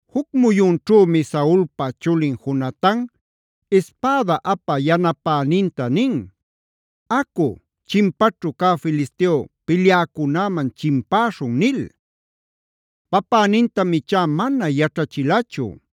Juc muyunćhümi Saulpa chulin Jonatan ispäda apä yanapäninta nin: “Acu, chimpaćhu cä Filisteo pilyäcunäman chimpäśhun” nil. Papänintam ichá mana yaćhachilachu.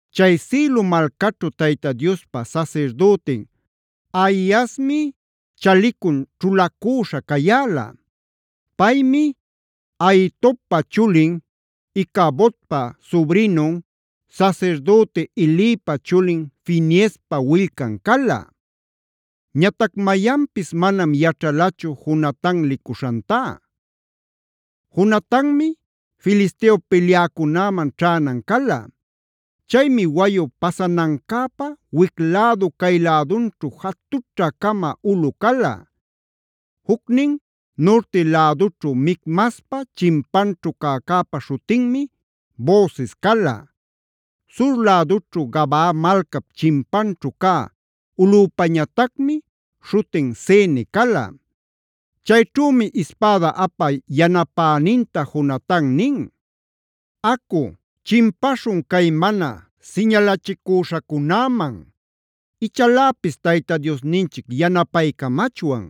Chay Silo malcaćhu Tayta Diospa sasirdütin Ahiasmi chalicuna ćhulacüśha cayäla. Paymi Ahitobpa chulin, Icabodpa subrinun, sasirdüti Elipa chulin Fineespa willcan cala. Ñatac mayanpis manam yaćhalachu Jonatan licuśhantá. Jonatanmi Filisteo pilyäcunäman ćhänan cala. Chaymi wayu pasanancäpä wic lädu cay lädunćhu jatućhä-cama ulꞌu cala. Jucnin nurti lädućhu Micmaspa chimpanćhu cäcäpa śhutinmi Boses cala; sur lädućhu Gabaa malcap chimpanćhu cä ulꞌüpañatacmi śhutin Sene cala. Chayćhümi ispäda apä yanapäninta Jonatan nin: “Acu, chimpaśhun cay mana siñalachicüśhacunäman. Ichaläpis Tayta Diosninchic yanapaycamachwan.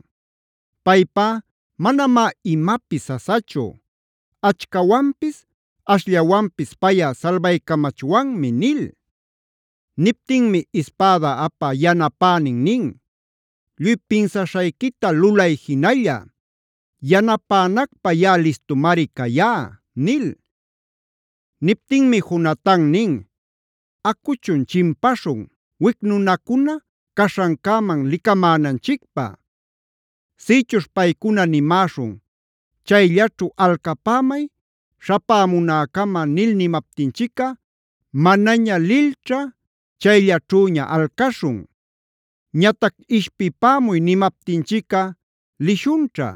Paypá manamá imapis sasachu. Achcawanpis ashllawanpis payꞌa salbaycamachwanmi” nil. Niptinmi ispäda apä yanapänin nin: “Lluy pinsaśhayquita lulay jinalla. Yanapänacpä yaꞌa listumari cayá” nil. Niptinmi Jonatan nin: “Acuchun chimpaśhun, wic nunacuna caśhancäman licamänanchicpä. Sïchuśh paycuna nimäśhun: ‘Chayllaćhu alcapämay śhapämunäcama’ nil nimaptinchicꞌa manaña lilćha chayllaćhüña alcaśhun. Ñatac ‘ishpipämuy’ nimaptinchicꞌa lishunćha.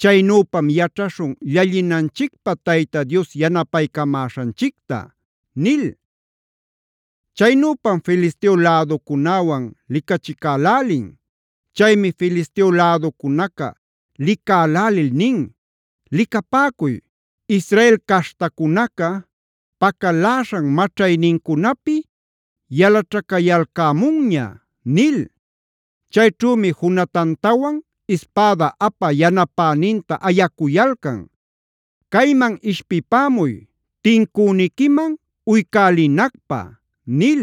Chaynüpam yaćhaśhun llallinanchicpä Tayta Dios yanapaycamäśhanchicta” nil. Chaynüpam Filisteo läducunäwan licachicälälin. Chaymi Filisteo läducunaca licalälil nin: “Licapäcuy, Israel caśhtacunaca pacaläśhan maćhaynincunapi yalaćhacayalcämunña” nil. Chayćhümi Jonatantawan ispäda apä yanapäninta ayacuyalcan: “¡Cayman ishpipämuy tincüniquiman uycälinacpä!” nil.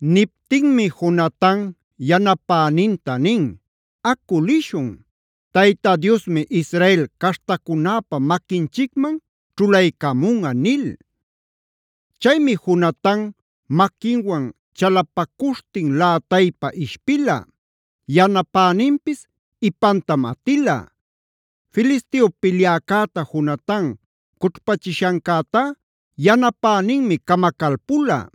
Niptinmi Jonatan yanapäninta nin: “Acu lishun, Tayta Diosmi Israel caśhtacunäpa maquinchicman ćhulaycamunꞌa” nil. Chaymi Jonatan maquinwan chalapacuśhtin lätaypa ishpila; yanapäninpis ipantam atila. Filisteo pilyäcäta Jonatan cućhpachishancätá yanapäninmi camacalpula.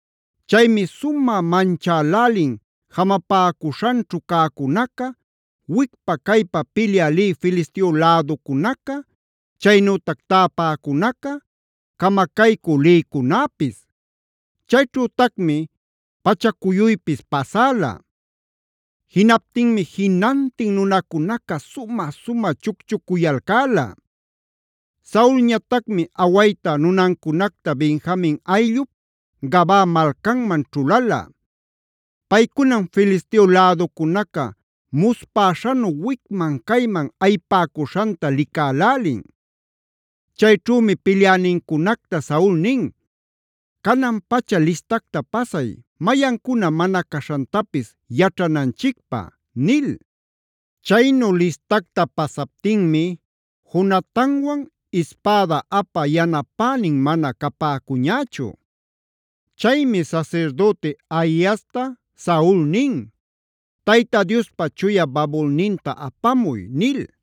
Chaymi sumä manchälälin jamapäcuśhanćhu cäcunaca, wicpa-caypa pilyä lï Filisteo läducunaca, chaynütac täpäcunaca, camacaycü lïcunäpis. Chayćhütacmi pachacuyuypis pasäla. Jinaptinmi jinantin nunacunaca sumä-sumä chucchucuyalcäla. Saulñatacmi awayta nunancunacta Benjamin ayllup Gabaa malcanman ćhulala. Paycunam Filisteo läducunaca muspäśhanu wicman-cayman ayipäcuśhanta licälälin. Chayćhümi pilyänincunacta Saul nin: “Canan-pacha listacta pasay, mayancuna mana caśhantapis yaćhananchicpä” nil. Chaynu listacta pasaptinmi Jonatanwan ispäda apä yanapänin mana capäcuñächu. Chaymi sasirdüti Ahiasta Saul nin: “Tayta Diospa chuya babulninta apamuy” nil.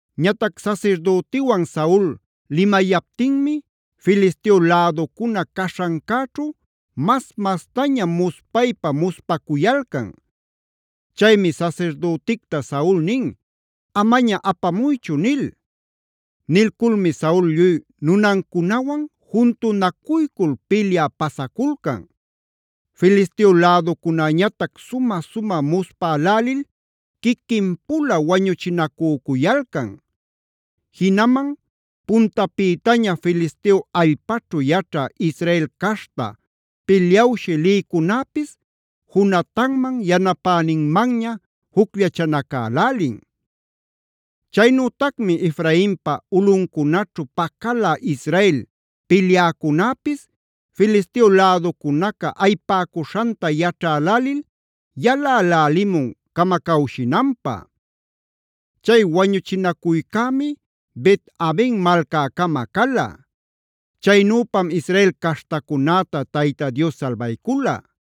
Ñatac sasirdütiwan Saul limayaptinmi Filisteo läducuna caśhancäćhu mas-mastaña muspaypa-muspacuyalcan. Chaymi sasirdüticta Saul nin: “Amaña apamuychu” nil. Nilculmi Saul lluy nunancunawan juntunacuycul pilyä pasaculcan. Filisteo läducunäñatac sumä-sumä muspälälil quiquin-pula wañuchinacücuyalcan. Jinaman puntapïtaña Filisteo allpaćhu yaćhä Israel caśhta pilyawshï lïcunäpis Jonatanman, yanapäninmanña jucllachanacälälin. Chaynütacmi Efrainpa ulꞌuncunaćhu pacalä Israel pilyäcunäpis Filisteo läducunaca ayipäcuśhanta yaćhälälil yalälälimun camacawshinanpä. Chay wañuchinacuycämi Bet-aven malcäcama cala. Chaynüpam Israel caśhtacunäta Tayta Dios salbaycula.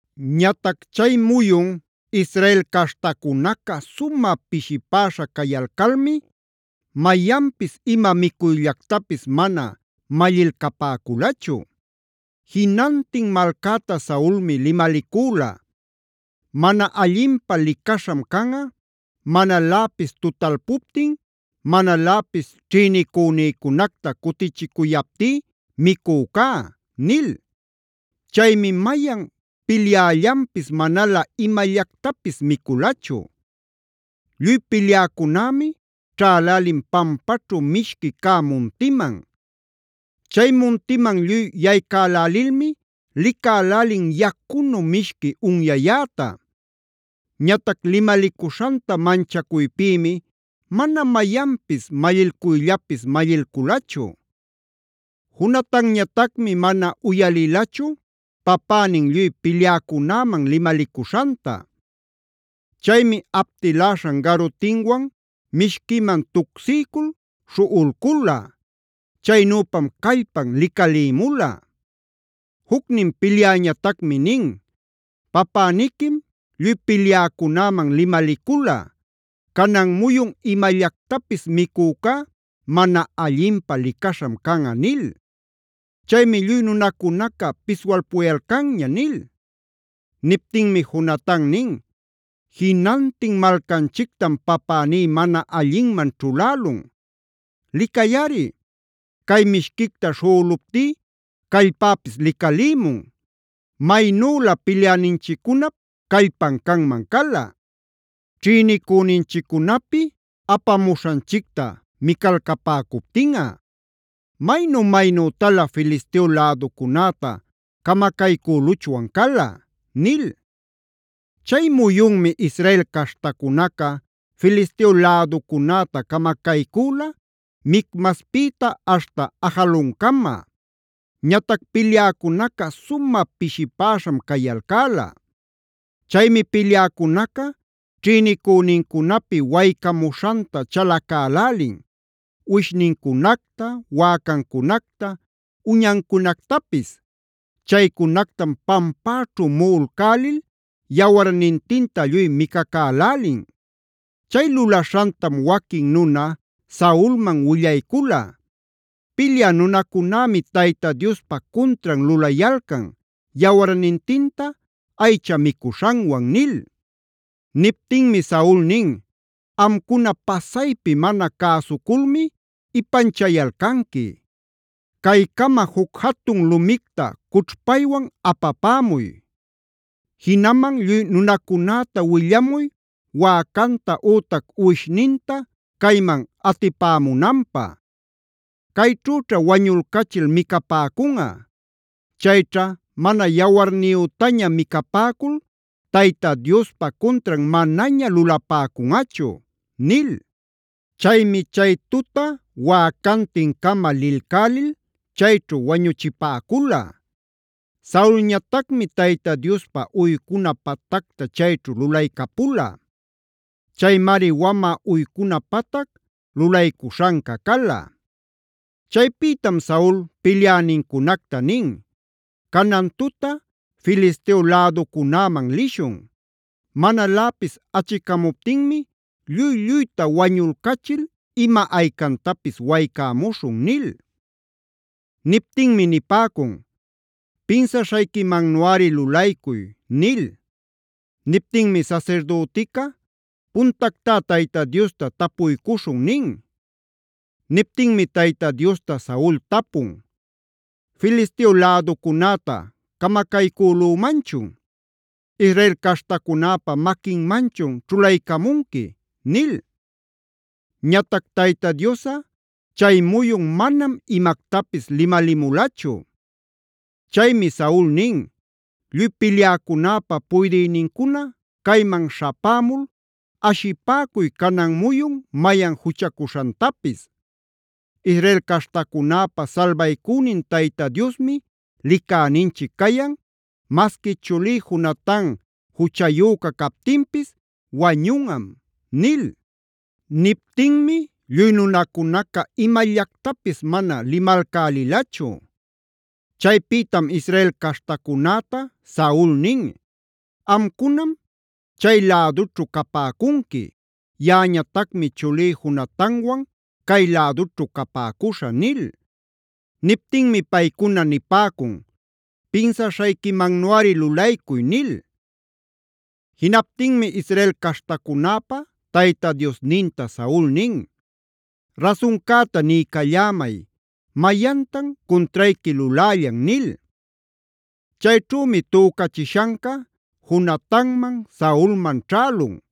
Ñatac chay muyun Israel caśhtacunaca sumä pishipäśha cayalcalmi mayanpis ima micuyllactapis mana mallilcapäculachu. Jinantin malcäta Saulmi limalicüla: “Mana allinpä licaśham canꞌa manaläpis tutalpuptin, manaläpis ćhïnicunïcunacta cutichicuyaptí micücá” nil. Chaymi mayan pilyällanpis manalä imallactapis miculachu. Lluy pilyäcunämi ćhälälin pampaćhu mishqui cä muntiman. Chay muntiman lluy yaycälälilmi licälälin yacunu mishqui unyayäta. Ñatac limalicuśhanta manchacuypïmi mana mayanpis mallilcuyllapis mallilculachu. Jonatanñatacmi mana uyalilachu papänin lluy pilyäcunäman limalicuśhanta. Chaymi aptiläśhan garutinwan mishquiman tucsiycul śhuꞌulcula. Chaynüpam callpan licalïmula. Jucnin pilyäñatacmi nin: “Papäniquim lluy pilyäcunäman limalicula: ‘Canan muyun imallactapis micücá mana allinpä licaśham canꞌa’ nil. Chaymi lluy nunacunaca piswalpuyalcanña” nil. Niptinmi Jonatan nin: “Jinantin malcanchictam papäní mana allinman ćhulälun. Licayꞌari cay mishquicta śhuꞌuluptí callpäpis licalïmun. Maynülä pilyäninchiccunap callpan canman cala ćhïnicüninchiccunapi apamuśhanchicta micalcapäcuptinꞌa. Maynu-maynütalä Filisteo läducunäta camacaycüluchwan cala” nil. Chay muyunmi Israel caśhtacunaca Filisteo läducunäta camacaycüla Micmaspïta aśhta Ajaloncama. Ñatac pilyäcunaca sumä pishipäśham cayalcäla. Chaymi pilyäcunaca ćhïnicünincunapi waycamuśhanta chalacälälin: uwishnincunacta, wäcancunacta, uñancunactapis. Chaycunactam pampäćhu muꞌulcälil yawarnintinta lluy micacälälin. Chay lulaśhantam waquin nuna Saulman willaycula: “Pilyä nunacunämi Tayta Diospa cuntran lulayalcan, yawarnintinta aycha micuśhanwan” nil.b Niptinmi Saul nin: “¡Amcuna pasaypi mana cäsuculmi ipanchayalcanqui! Caycama juc jatun lumicta cućhpaywan apapämuy. Jinaman lluy nunacunäta willamuy wäcanta ütac uwishninta cayman atipämunanpä. Cayćhüćha wañulcachil micapäcunꞌa. Chayćha mana yawarniyütaña micapäcul Tayta Diospa cuntran manaña lulapäcunꞌachu” nil. Chaymi chay tuta wäcantin-cama lilcälil chayćhu wañuchipäcula. Saulñatacmi Tayta Diospä uycuna patacta chayćhu lulaycapula. Chaymari wamä uycuna patac lulaycuśhanca cala. Chaypïtam Saul pilyänincunacta nin: “Canan tuta Filisteo läducunäman lishun. Manaläpis achicämuptinmi lluy-lluyta wañulcachil ima aycantapis waycämuśhun” nil. Niptinmi nipäcun: “Pinsaśhayquimannuꞌari lulaycuy” nil. Niptinmi sasirdütica: “Puntactá Tayta Diosta tapuycuśhun” nin. Niptinmi Tayta Diosta Saul tapun: “¿Filisteo läducunäta camacaycülümanchun? ¿Israel caśhtacunäpä maquinmanchun ćhulaycamunqui?” nil. Ñatac Tayta Diosꞌa chay muyun manam imactapis limalimulachu. Chaymi Saul nin: “Lluy pilyäcunäpä puydïnincuna cayman śhapämul ashipäcuy canan muyun mayan juchacuśhantapis. Israel caśhtacunäpä salbaycünin Tayta Diosmi licäninchic cayan, masqui chulí Jonatan juchayüca captinpis wañunꞌam” nil. Niptinmi lluy nunacunaca imallactapis mana limalcälilachu. Chaypïtam Israel caśhtacunäta Saul nin: “Amcunam chay-lädućhu capäcunqui; yaꞌañatacmi chulí Jonatanwan cay lädućhu capäcuśhä” nil. Niptinmi paycuna nipäcun: “Pinsaśhayquimannuꞌari lulaycuy” nil. Jinaptinmi Israel caśhtacunäpa Tayta Diosninta Saul nin: “Rasuncäta niycallämay, ¿mayantan cuntrayqui lulällan?” nil. Chayćhümi tücachishanca Jonatanman, Saulman ćhälun.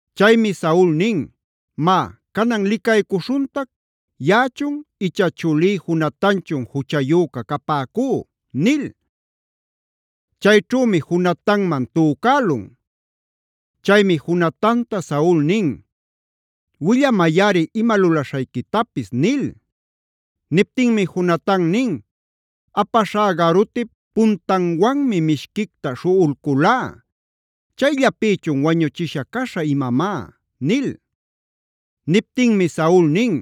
Chaymi Saul nin: “Má canan licaycuśhuntac, yaꞌachun icha chulí Jonatanchun juchayüca capäcú” nil. Chayćhümi Jonatanman tücälun. Chaymi Jonatanta Saul nin: “Willamayꞌari ima lulaśhayquitapis” nil. Niptinmi Jonatan nin: “Apaśhá garutip puntanwanmi mishquicta śhuꞌulculá. ¿Chayllapïchun wañuchisha caśhä imamá?” nil. Niptinmi Saul nin: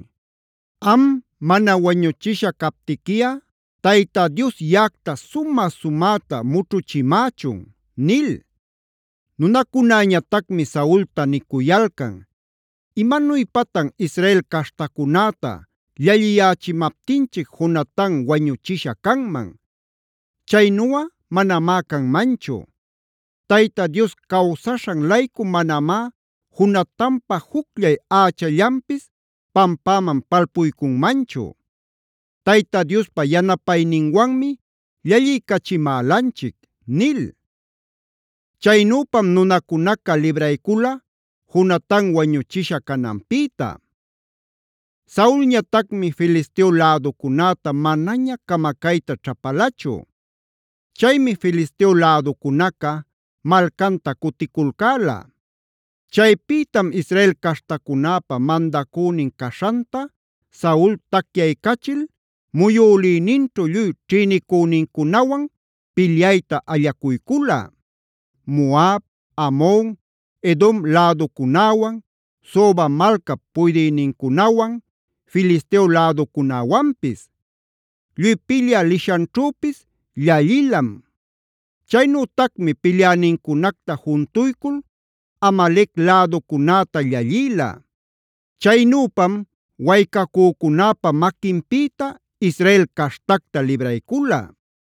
“Am, mana wañuchisha captiquiꞌa Tayta Dios yaꞌacta sumä-sumäta mućhuchimächun” nil. Nunacunäñatacmi Saulta nicuyalcan: “Imanuypatan Israel caśhtacunäta llalliyächimaptinchic Jonatan wañuchisha canman. ¡Chaynuꞌa manamá canmanchu! Tayta Dios cawsaśhan-laycu manamá Jonatanpa jucllay ächallanpis pampäman palpuycunmanchu. Tayta Diospa yanapayninwanmi llalliycachimälanchic” nil. Chaynüpam nunacunaca libraycula Jonatan wañuchisha cananpïta. Saulñatacmi Filisteo läducunäta manaña camacayta ćhapalachu. Chaymi Filisteo läducunaca malcanta cuticulcäla. Chaypïtam Israel caśhtacunäpa mandacünin caśhanta Saul tacyaycachil muyülïninćhu lluy ćhïnicünincunawan pilyayta allacuycula: Moab, Amon, Edom läducunäwan, Soba malcap puydïnincunawan, Filisteo läducunäwanpis. Lluy pilyä lishanćhüpis llallilam. Chaynütacmi pilyänincunacta juntuycul Amalec läducunäta llallïla. Chaynüpam waycacücunäpa maquinpïta Israel caśhtacta libraycula.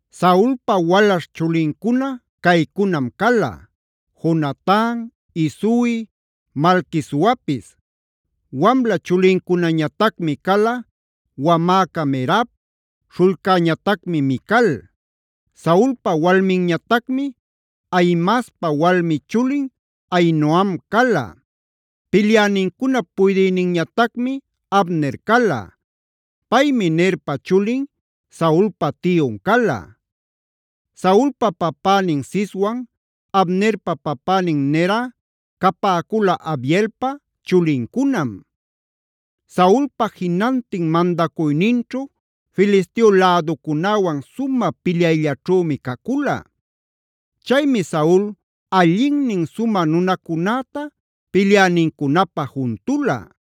Saulpa walaśh chulincuna caycunam cala: Jonatan, Isui, Malquisuapis. Wamla chulincunañatacmi cala: Wamäca Merab, śhullcäñatami Mical. Saulpa walminñatacmi Ahimaaspa walmi chulin Ahinoam cala. Pilyänincunap puydïninñatacmi Abner cala. Paymi Nerpa chulin, Saulpa tiyun cala. Saulpa papänin Ciswan Abnerpa papänin Nerꞌa capäcula Abielpa chulincunam. Saulpa jinantin mandacuyninćhu Filisteo läducunäwan sumä pilyayllaćhümi cacula. Chaymi Saul allinnin sumä nunacunäta pilyänincunapä juntula.